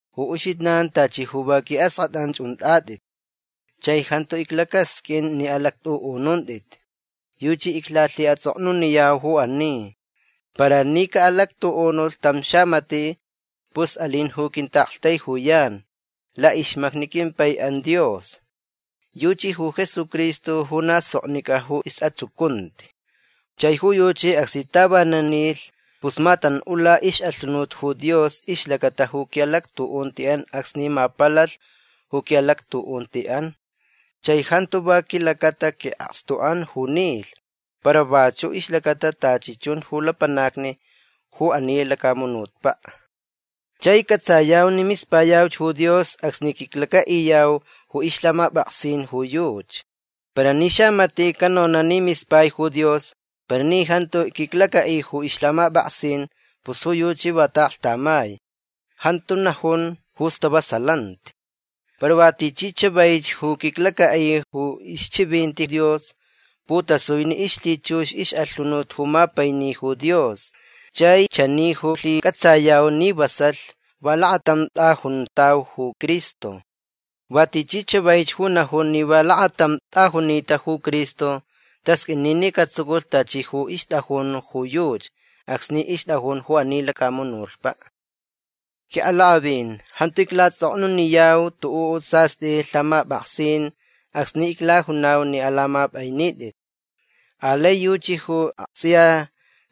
Ju uxijnan tachi ju va qui'ask'at'an unt'at'it. Chai jantu iclacasq'uin ni alact'u'ununt'it. Yuchi iclalhi'ats'oknuniyau ju ani. Para ni ca'alactu'unulh tam xamati' pus alin ju quinta'aktaijuyan la'ixmacni quimpai'an Dios. Yuchi ju Jesucristo ju na soknic'a ju is'atsucunti. Chai ju yuchi acsni tavanan nilh pus matan'ula ix'alhunut ju Dios ixlacata ju qui'alactu'unti'an acsni mapalalh ju qui'alactu'unti'an. Chai jantu va quilacata qui'akstu'an ju nilh para vachu' ixlacata tachi chun ju lapanacni ju ani lacamunutpa'. Chai c'atsayau ni mispayauch ju Dios acsni quiclaca'iyau ju ixlhamap'aksin ju yuchi. Para ni xamati' canona' ni mispai ju Dios para ni jantu quiclaca'i ju ixlhamap'aksin pus ju yuchi va ta'aklhtamai. Jantu najun ju stavasalanti. Para va tichi chavaich ju quiclaca'i ju ixchivinti Dios putasui ni ixlhichux ix'alhunut ju mapaini ju Dios. Chai chani ju lhic'atsayau ni vasalh va lakatam t'ajuntau ju Cristo. Va tichi chavaich ju najun ni va lakatam t'ajunita ju Cristo tasq'uini ni catsuculh tachi ju ixt'ajun ju yuchi acsni ixt'ajun ju ani lacamunutpa'. Qui'alak'avin jantu icla'ats'oknuniyau tu'u' sast'i lhamap'aksin acsni iclajunau ni alamap'ainit'it. Alai yuchi ju akts'iya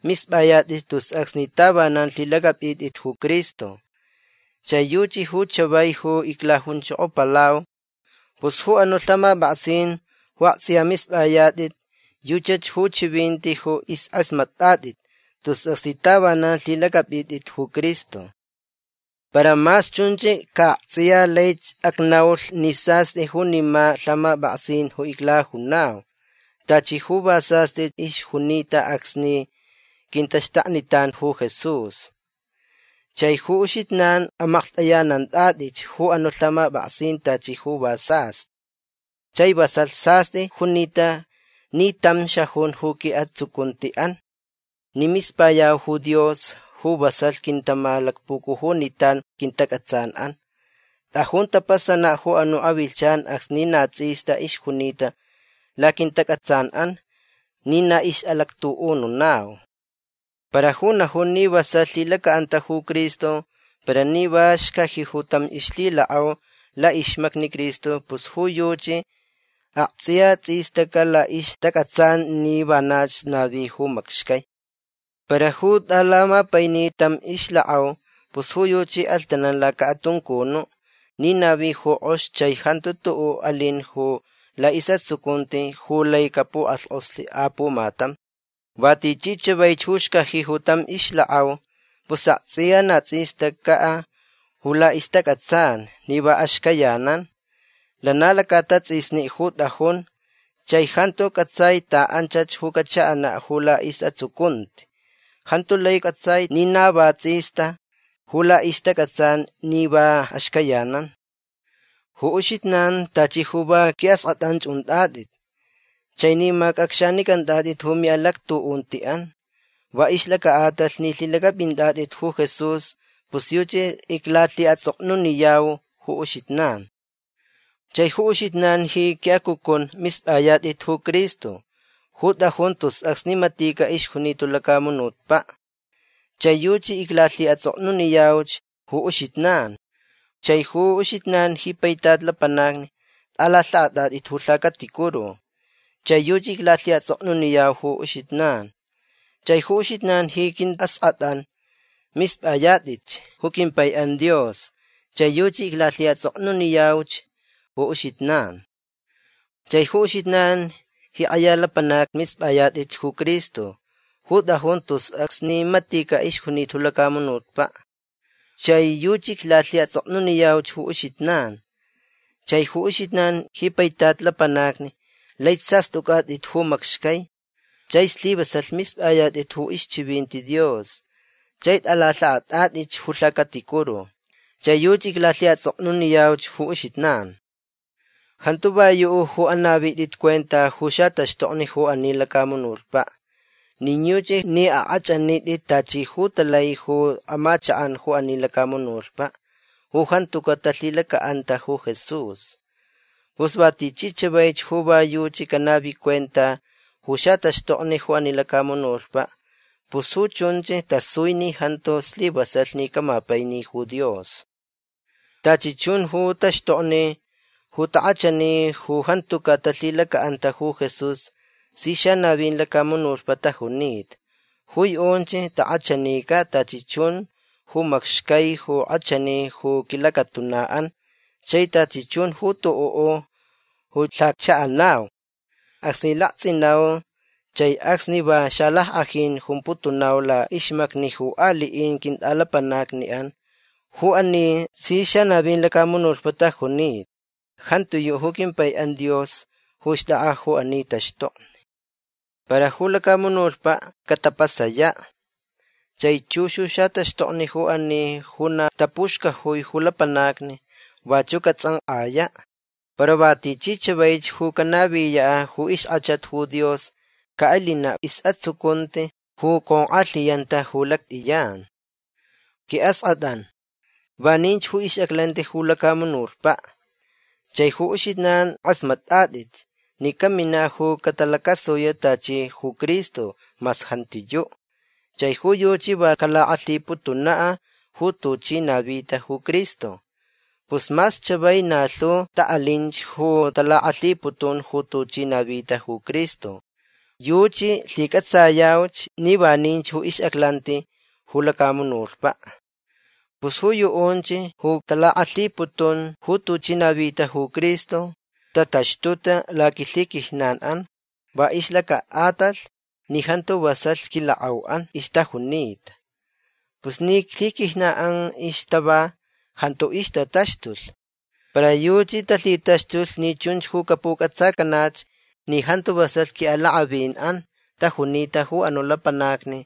misp'ayat'it tus acsni tavanan lhilac'ap'it'it ju Cristo. Chai yuchi ju chavai ju iclajunchokopalau. Pus ju anu' lhamap'aksin ju akts'iya misp'ayat'it yuchach ju chivinti ju isk'asmat'at'it tus acsni tavanan lhilac'ap'it'it ju Cristo. Para mas chunch ca akts'iya laich acnaulh ni sast'i junima lhamap'aksin ju iclajunau. Tachi ju va sast'i ixjunita acsni quintaxtaknitan ju Jesús. Chai ju uxijnan amaklht'ayanant'at'it ju anu' lhamap'aksin tachi ju va sast'i. Chai vasalh sast'i junita ni tam xajun ju qui'atsucunti'an ni mispayau ju Dios ju vasalh quintamalacpucujunitan quintac'atsan'an. T'ajun tapasana' ju anu' avilhchan acsni na ts'ista ixjunita laquintac'atsan'an ni na ix'alactu'ununau. Para ju najun ni vasalh lhilaca'anta ju Cristo para ni va xcaji ju tam ixlhilak'au la'ixmacni Cristo pus ju yuchi akts'iya ts'istaca' la'ixtac'atsan ni vanach navi ju macxcai. Para ju t'alamapaini tam ixlak'au pus ju yuchi alhtanan laca'atuncunu' ni navi ju k'ox chai jantu tu'u' alin ju la'is'atsucunti ju lai capuk'alhk'oslh apumatam. Va tichi chavaich ju xcaji ju tam ixlak'au pus akts'iya na ts'istaca' ju la'ixtac'atsan ni va axcayanan. Lana laca'atats'isni ju t'ajun chai jantu c'atsai ta'anchach ju cacha'ana' ju la'is'atsucunti. Jantu lai c'atsai ni na va ts'ista ju la'ixtac'atsan ni va axcayanan. Ju uxijnan tachi ju va qui'ask'at'an unt'at'it. Chai ni mac'acxanic'ant'at'it ju mi'alactu'unti'an va ixlaca'atalh ni lhilac'ap'int'at'it ju Jesús pus yuchi iclalhi'ats'oknuniyau ju uxijnan. Chai ju uxijnan ji qui'acucun misp'ayat'it ju Cristo ju t'ajun tus acsni matica' ixjunita ju lacamunutpa'. Chai yuchi iclalhi'ats'oknuniyauch ju uxijnan. Chai ju uxijnan ji paitat lapanacni t'alalha'at'at'it ju lhacaticuru. Chai yuchi iclalhi'ats'oknuniyauch ju uxijnan. Chai ju uxijnan ji qui'ask'at'an misp'ayat'itch ju quimpai'an Dios. Chai yuchi iclalhi'ats'oknuniyauch ju uxijnan. Chai ju uxijnan ji k'aya lapanacni misp'ayat'it ju Cristo ju t'ajun tus acsni matica' ixjunita ju lacamunutpa'. Chai yuchi iclalhi'ats'oknuniyauch ju uxijnan. Chai ju uxijnan ji paitat lapanacni lai sast'uc'at'it ju macxcai chai slivasalh misp'ayat'it ju ixchivinti Dios chai t'alalha'at'at'itch ju lhacaticuru. Chai yuchi iclalhi'ats'oknuniyauch ju uxijnan. Jantu va yu' ju anavit'it cuenta ju xataxtokni ju ani lacamunutpa'. Nin yuchi ni ak'ach'anit'it tachi ju talai ju amachak'an ju ani lacamunutpa' ju jantuca' talhilaca'anta ju Jesús. Pus va tichi chavaich ju va yuchi canavi cuenta ju xataxtokni ju ani lacamunutpa' pus ju chunch tasui ni jantu slivasalh ni camapaini ju Dios. Tachi chun ju taxtokni ju tak'achani ju jantuca' talhilaca'anta ju Jesús si xanavin lacamunutpa' tajunita. Ju yu'unch tak'achanica' tachi chun ju macxcai ju k'achani ju quilacatuna'an chai tachi chun ju tu'u' ju lhaccha'anau acsni lakts'inau chai acsni va xalack'ajin jumputunau la'ixmacni ju ali'in quint'alapanacni'an. Ju ani si xanavin lacamunutpa' tajunita. Jantiyu' ju quimpai'an Dios ju xt'ak'a ju ani taxtokni. Para ju lacamunutpa' catapasaya'. Chai chux ju xataxtokni ju ani ju na tapuxcajui ju lapanacni vachu' cats'ank'aya'. Para va tichi chavaich ju canaviya' ju ixk'achat ju Dios ca'alina' is'atsucunti ju conk'alhiyanta ju lact'iyan. Qui'ask'at'an vaninch ju ix'aclanti ju lacamunutpa'. Chai ju uxijnan k'asmat'at'it ni camina' ju catalacasuya' tachi ju Cristo mas jantiyu'. Chai ju yuchi va calak'alhiputuna' ju tuchi navita ju Cristo. Pus mas chavai na lhu ta'alinch ju talak'alhiputun ju tuchi navita ju Cristo. Yuchi lhic'atsayauch ni vaninch ju ix'aclanti ju lacamunutpa'. Pus ju yu'unch ju talak'alhiputun ju tuchi navita ju Cristo tataxtuta laquilhiquijnan'an va ixlaca'atalh ni jantu vasalh quilak'au'an ixtajunita. Pus ni lhiquijnan'an ixtava jantu ixtataxtulh. Para yuchi talhitaxtulh ni chunch ju capuc'atsacanach ni jantu vasalh qui'alak'avin'an tajunita ju anu' lapanacni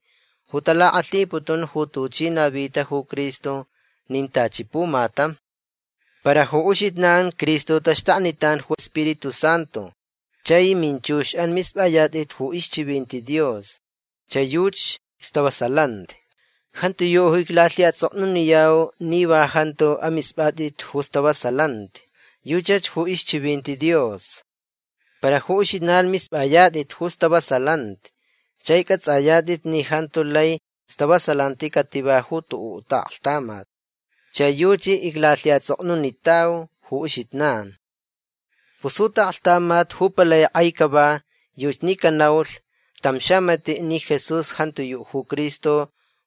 ju talak'alhiputun ju tuchi navita ju Cristo. Nin tachi pumatam. Para ju uxijnan Cristo taxtaknitan ju Spiritu Santu chai minchux'an misp'ayat'it ju ixchivinti Dios. Chai ju yuchi stavasalanti. Jantiyu' ju iclalhi'ats'oknuniyau ni va jantu amisp'at'it ju stavasalanti. Yuchach ju ixchivinti Dios. Para ju uxijnan misp'ayat'it ju stavasalanti chai c'ats'ayat'it ni jantu lai stavasalanti cativa ju tu'u' ta'aklhtamat. Chai yuchi iclalhi'ats'oknunitau ju uxijnan. Pus ju ta'aklhtamat ju palai k'ai cava yuchi ni canaulh tam xamati' ni Jesús jantiyu' ju Cristo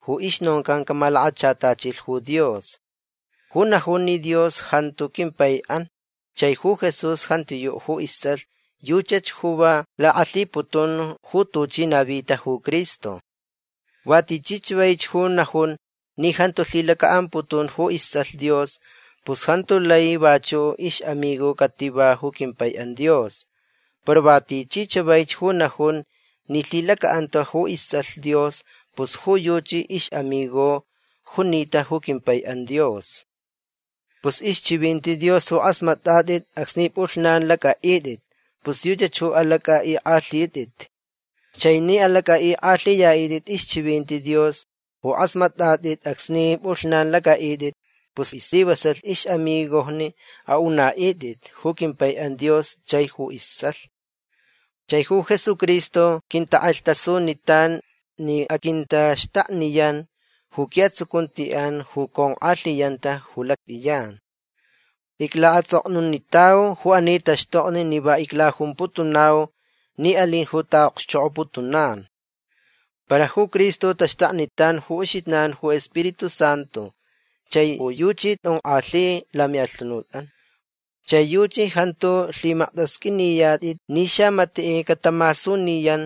ju ixnoncan camalakachatachilh ju Dios. Ju najun ni Dios jantu quimpai'an chai ju Jesús jantiyu' ju ists'alh yuchach ju va lak'alhiputun ju tuchi navita ju Cristo. Va tichi chavaich ju najun ni jantu lhilaca'amputun ju ists'alh Dios pus jantu lai vachu' ix'amigo cativa ju quimpai'an Dios. Para va tichi chavaich ju najun ni lhilaca'anta ju ists'alh Dios pus ju yuchi ix'amigo junita ju quimpai'an Dios. Pus ixchivinti Dios ju k'asmat'at'it acsni p'ulhnan lac'a'it'it pus yuchach ju alac'a'ik'alhit'it. Chai ni alac'a'ik'alhiya'it'it ixchivinti Dios ju k'asmat'at'it acsni p'ulhnan lac'a'it'it pus islivasalh ix'amigojni a'una'it'it ju quimpai'an Dios chai ju ists'alh. Chai ju Jesucristo quintak'alhtasunitan ni aquintaxtakniyan ju qui'atsucunti'an ju conk'alhiyanta ju lact'iyan. Icla'ats'oknunitau ju ani taxtokni ni va iclajumputunau ni alin ju ta'a'okxchok'oputunan. Para ju Cristo taxtaknitan ju uxijnan ju Spiritu Santu chai ju yuchi t'onk'alhi lami'alhunut'an. Chai yuchi jantu lhimaktasq'uiniyat'it ni xamati' catamasuniyan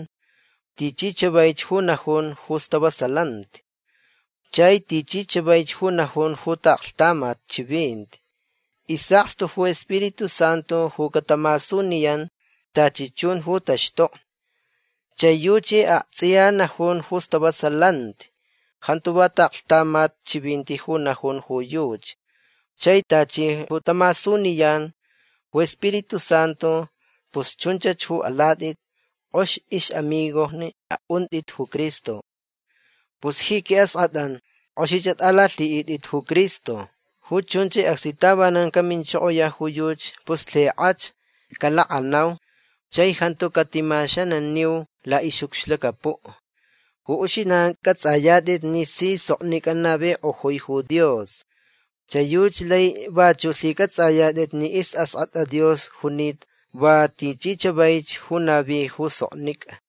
tichi chavaich ju najun ju istavasalanti chai tichi chavaich ju najun ju ta'aklhtamat chivinti. Is'akstu ju Spiritu Santu ju catamasuniyan tachi chun ju taxtokni. Chai ju yuchi akts'iya najun ju stavasalanti. Jantu va ta'aklhtamat chivinti ju najun ju yuchi. Chai tachi ju tamasuniyan ju Spiritu Santu pus chunchach ju alat'it. K'ox ix'amigojni a'unt'it ju Cristo. Pus ji qui'ask'at'an k'oxich at'alalhi'it'it ju Cristo. Ju chunch acsni tavanan caminchokoya' ju yuchi pus lhik'ach calak'anau chai jantu catimaxananiu la'ix'ucxlacapu'. Ju uxijnan c'ats'ayat'it ni si soknic'a navik'ojui ju Dios. Chai yuchi lai vachu' lhic'ats'ayat'it ni is'ask'at'a Dios junita va tichi chavaich ju navi ju soknic'a.